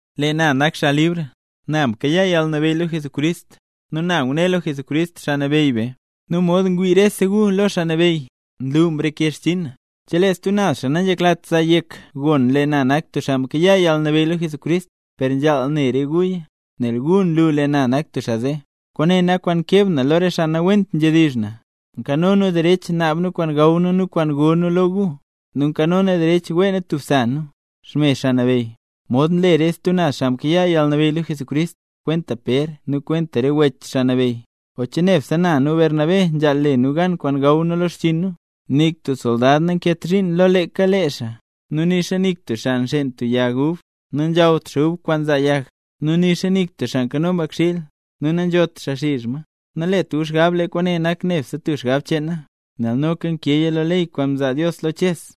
Lee na nak xaa libr. Na mkayaa yalnabeyy lo Jesucrist, nu na ngune lo Jesucrist, Xaa Nabeyy be. Nu mod ngwii rese gu lo Xaa Nabeyy, nlu mreke xchinn na. Chelee stub xaa nanzheklat zaa yek gon lee na nak tub xaa mkayaa yalnabeyy lo Jesucrist, per nzhaal ne re guya, nel gu nlu lee na nak tub xaa zee. Kwaane nak kwaan nkeb na lo re xaa nawent nzhedizh na. Nkano nu derech naab nu kwaan gaw nu nu kwaan go nu lo gu. Nu noka nkano nu derech wee nu tub sa nu, xme Xaa Nabeyy, mod nle re stub naz xaa mkayaa yalnabeyy lo Jesucrist, kwenta Pér nu kwenta re wech Xaa Nabeyy. ¿O che nebse na nu Bernabé nzhaal le nu gan kwaan gaw nu lo xchiin nu? Nik tub soldad nankeet zhiin lo leeka lee xaa; nu nixa nik tub xaa nxeen tub xan yag ub, nu nanzhawt xaa ub kwaan nzaa yag; nu nixa nik tub xaa nkano mbakxiil, nu nanzhot xaa xizh ma. Nalet gu xgab lee kwaane nak nebse tub xgab cheen na, nel noka nkeeya lo ley kwaan mzaa Dios lo Ches.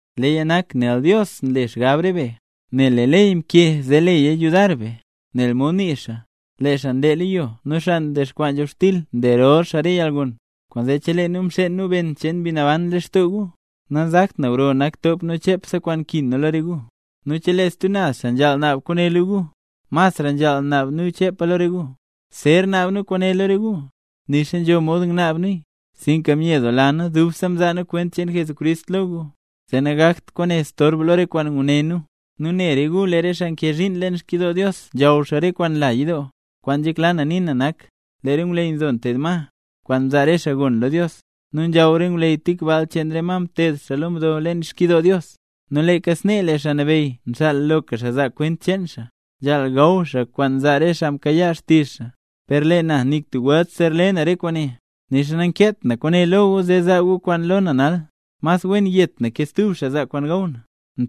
leeya nak nel Dios nle xgab re be. Nel lee ley mkee zee leya yudar be, nel mod nii xaa: “Lee xaa nlee lo yo nu xaa nkich nzhobxtil nle rol xaa re yalgon”. Kwaanzee, chelee nu mxeen nu ben cheen Mbi Naban lextoo gu, nanzakt na gro nak top nu chepse kwaan nkin nu lo re gu. Nu chelee stub naz xaa nzhaal naab kwaane lo gu, mas nzhaal naab nu chepa lo re gu. Zer naab nu kwaane lo re gu, nixa nzho mod ngnaab nuya, sinka myedoola nu dubse mzaa nu kwent cheen Jesucrist lo gu, zee nangakt kwaane storb lo re kwaan nguné nu. Nu ne re gu, lee re xaa nkee zhiin leen xkyidoo Dios nzhaw xaa re kwaan nla yidoo. Kwaan nzhekla na nii na nak, lee re ngwleyy nzo nteed ma, kwaan mzaa re xaa lo Dios, nu nzhaw re ngwleyy tik baal cheen re ma nteed xaa lo mdo leen xkyidoo Dios. Nu leeka snee, lee Xaa Nabeyy nxaal loka xaa zaa kwent cheen xaa, nzhaal gaw xaa kwaan nzaa re xaa mkayaa xtizh xaa. Per lee na nik tub welt zer le na re kwaane, nixa nankeet na kwaane lo gu zee zaa gu kwaan lo na nal. ¡Mas wen yet na ke stub xaa zaa kwaan gaw na!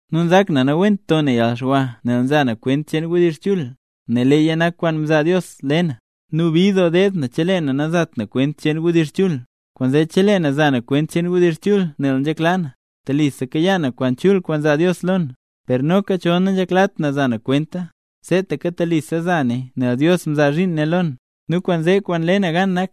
Nu nzak na nawent to na yalxwa nel nza na kwent cheen wdizh chul, nel leeya nak tub kwaan mzaa Dios le na. ¡Nu bid doo deed na chelee na nazat na kwent cheen wdizh chul! Kwaanzee, chelee na za na kwent cheen wdizh chul nel nzhekla na, telisa kayaa na kwaan chul kwaan zaa Dios lo na. Per noka chol nanzheklat na za na kwenta, seetaka telisa za naya nel Dios mzaa zhiin ne lo na. Nu kwaanzee, kwaan nle na gan nak,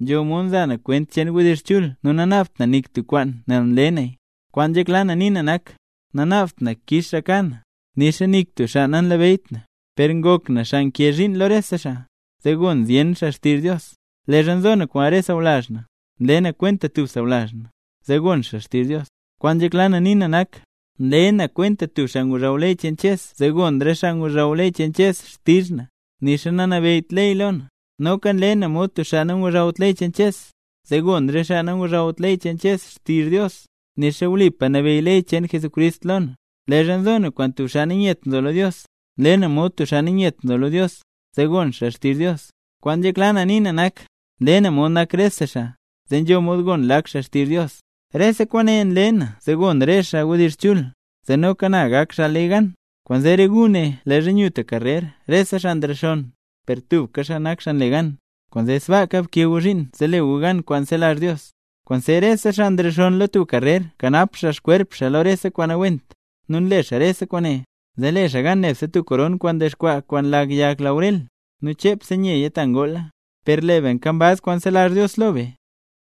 nzho mod nza na kwent cheen wdizh chul nu nanaabt na nik tub kwaan nel mle naya. Kwaan nzhekla na nii na nak, nanaabt na kix xaa ka na. Nixa nik tub xaa nanabeyyt na, per ngok na xaa nkee zhiin lo rese xaa, zee gon zyen xaa xtizh Dios. Leezha nzo na kwaan re sawlazh na, nle na kwenta tub xaa sawlazh na, zee gon xaa xtizh Dios. Kwaan nzhekla na nii na nak, nle na kwenta nak tub xaa ngozhaw ley cheen Ches zee gon re xaa ngozhaw ley cheen Ches xtizh na, nixa nanabeyyt ley lo na. Noka nle na mod tub xaa nangozhawt ley cheen Ches, zee gon re xaa nangozhawt ley cheen Ches xtizh Dios; nixa wlipa nabeyy ley cheen Jesucrist lo na. Leezha nzo na kwaan tub xaa nanyet nzo lo Dios, nle na mod tub xaa nanyet nzo lo Dios, zee gon xaa xtizh Dios. Kwaan nzhekla na nii na nak, nle na mod nak rese xaa, zee nzho mod gon lak xaa xtizh Dios. Rese kwaane nle na zee gon re xaa wdizh chul, zee noka na gak xaa le gan. Kwaanzee re gu ne leezha nyu tub karrer rese xaa nrexonn, per tubka xaa nak xaa nle gan. Kwaanzee sbaaka bkee gu zhiin zee le gu gan kwaan zelazh Dios. Kwaanzee rese xaa nrexonn lo tub karrer nkanap xaa xkwerp xaa lo rese kwaan nawent. Nu nle xaa rese kwaane, zee le xaa gan nebse tub koron kwaan ndexkwaa kwaan lag yag laurel, nu chepse nyeya ta ngoola. Per lee be nkambaz kwaan zelazh Dios lo be,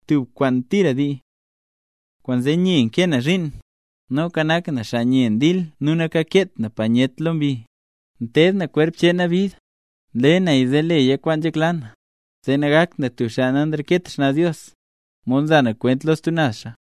tub kwaan tira dii. Kwaanzee nye nkee na zhiin, noka nak na tub xaa nye ndil nu nakakeet na panyet lo mbi. Nteed na kwerp cheen na bid, nle naya zee leya kwaan nzhekla na, zee nagakt na tub xaa nanreket xnaz Dios, mod nza na kwent lo stub naz xaa.